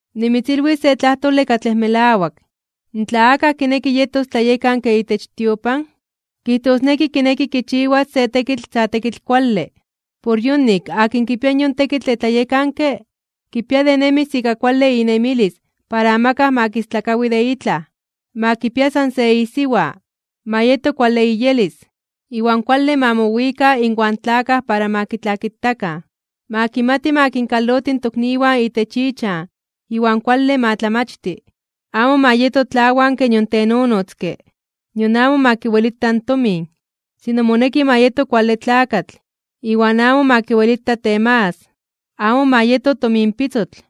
Nimitzilwis se tlajtole katlej melawak: tla akaj kineki yetos tlayekanke itech tiopan, kijtosneki kineki kichiwas se tekitl sa tekitl kuale. Por yonik akin kipia yon tekitl de tlayekanke, kipia de nemis ika kuale inemilis para amakaj ma kistlakawi de itlaj. Ma kipia san se isiwa, ma yeto kuale iyelis, iwan kuale ma mowika inwan tlakaj para ma kitlakitakan. Ma kimati ma kinkaloti in tokniwan itech ichan iwan kuale ma tlamachti. Amo ma yeto tlawanke nion tenonotzke, nion amo ma kiwelita in tomin. Sino moneki ma yeto kuale tlakatl, iwan amo ma kiwelita temagas (temakas). Amo ma yeto tominpitzotl.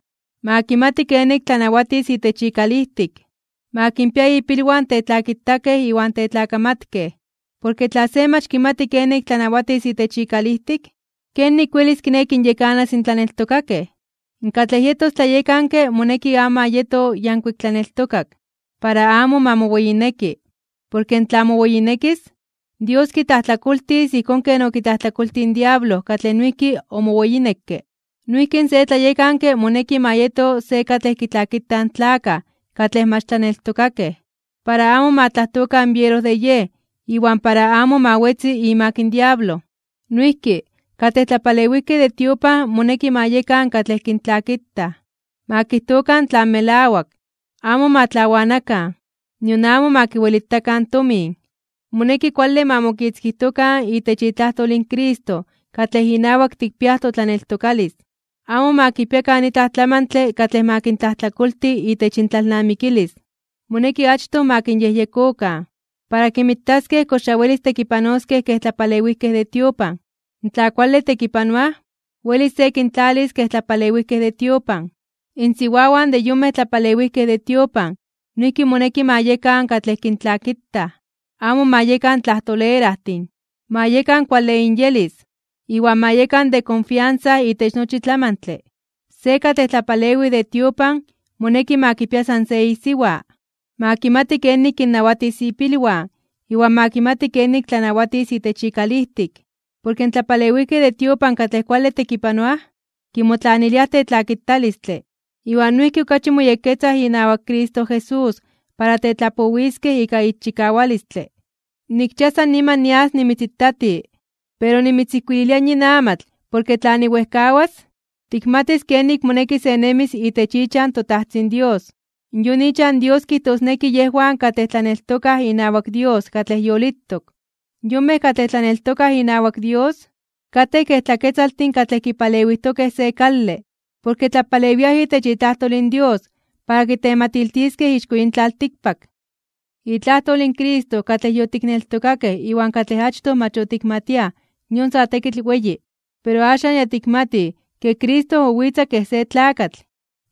Ma kimati kenik tlanawatis itech ikalijtik, ma kinpia ipilwan tetlakitakej iwan tetlakamatkej. Porke tla se mach kimati kenik tlanawatis itech ikalijtik, ¿kenik welis kiné kinyekanas in tlaneltokakej? Katlej yetos tlayekanke moneki amo ma yeto yankuik tlaneltokak, para amo ma moweyineki, porke tla moweyinekis, Dios kitlajtlakoltis ijkón ken okitlajtlakoltij in diablo katlej noijki omoweyinekke. Noijki se tlayekanke moneki ma yeto se katlej kitlakitaj in tlakaj katlej mach tlaneltokakej, para amo ma tlajtokan biero de yej iwan para amo ma wetzi imak in diablo. Noijki, katlej tlapalewijkej de tiopan moneki ma yekan katlej kintlakitaj. Ma kijtokan tlan melawak, amo ma tlawanakan, nion amo ma kiwelitakan tomin. Moneki kuale ma mokitzkijtokan itech itlajtol in Cristo katlej inawak tikpiaj totlaneltokalis. Amo ma kipiakan itlaj tlamantle katlej ma kintlajtlakolti itech intlalnamikilis. Moneki achtoj ma kinyejyekokan, para kinmitaskej kox ya welis tekipanoskej kej tlapalewijkej de tiopan. Tla kuale tekipanoaj, welis se kintlalis kej tlapalewijkej de tiopan. Insiwawan de yonmej tlapalewijkej de tiopan noijki moneki ma yekan katlej kintlakitaj, amo ma yekan tlajtolerajtin, ma yekan kuale inyelis, iwan ma yekan de konfiansa itech nochi tlamantle. Se katlej tlapalewij de tiopan moneki ma kipia san se isiwa, ma kimati kenik kinnawatis ipilwan iwan ma kimati kenik tlanawatis itech ikalijtik. Porke in tlapalewijkej de tiopan katlej kuale tekipanoaj, kimotlaniliaj tetlakitalistle, iwan noijki okachi moyekketzaj inawak Cristo Jesús para tetlapowiskej ika ixchikawalistle. Nikchia san niman nias nimitzitati. Pero nimitzijkuililia yin amatl porke tla niwejkawas, tikmatis kenik moneki se nemis itech ichan toTajtzin Dios. Yon ichan Dios kijtosneki yejwan katlej tlaneltokaj inawak Dios katlej yolitok. Yonmej katlej tlaneltokaj inawak Dios, katej kej tlaketzaltin katlej kipalewijtokej se kale, porke tlapalewiaj itech itlajtol in Dios para kitematiltiskej ixko yin tlaltikpak. Itlajtol in Cristo katlej yotikneltokakej iwan katlej achtoj mach otikmatiaj yon sa tekitl weyi. Pero axan ya tikmatij ke: Cristo owitza kej se tlakatl;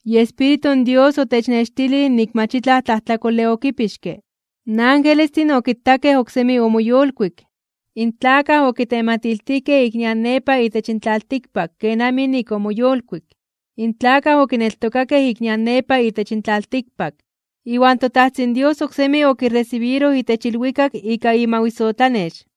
iEspíritu in Dios otechnextilij nik mach itlaj tlajtlakole okipixke. In angelestin okitakej oksemi omoyolkuik. In tlakaj okitematiltijkej ik nian nepa itech tlaltikpak kenamij nik omoyolkuik. In tlakaj okineltokakej ik nian nepa itech tlaltikpak. Iwan toTajtzin Dios oksemi okiresibiroj itech ilwikak ika imawisotlanex.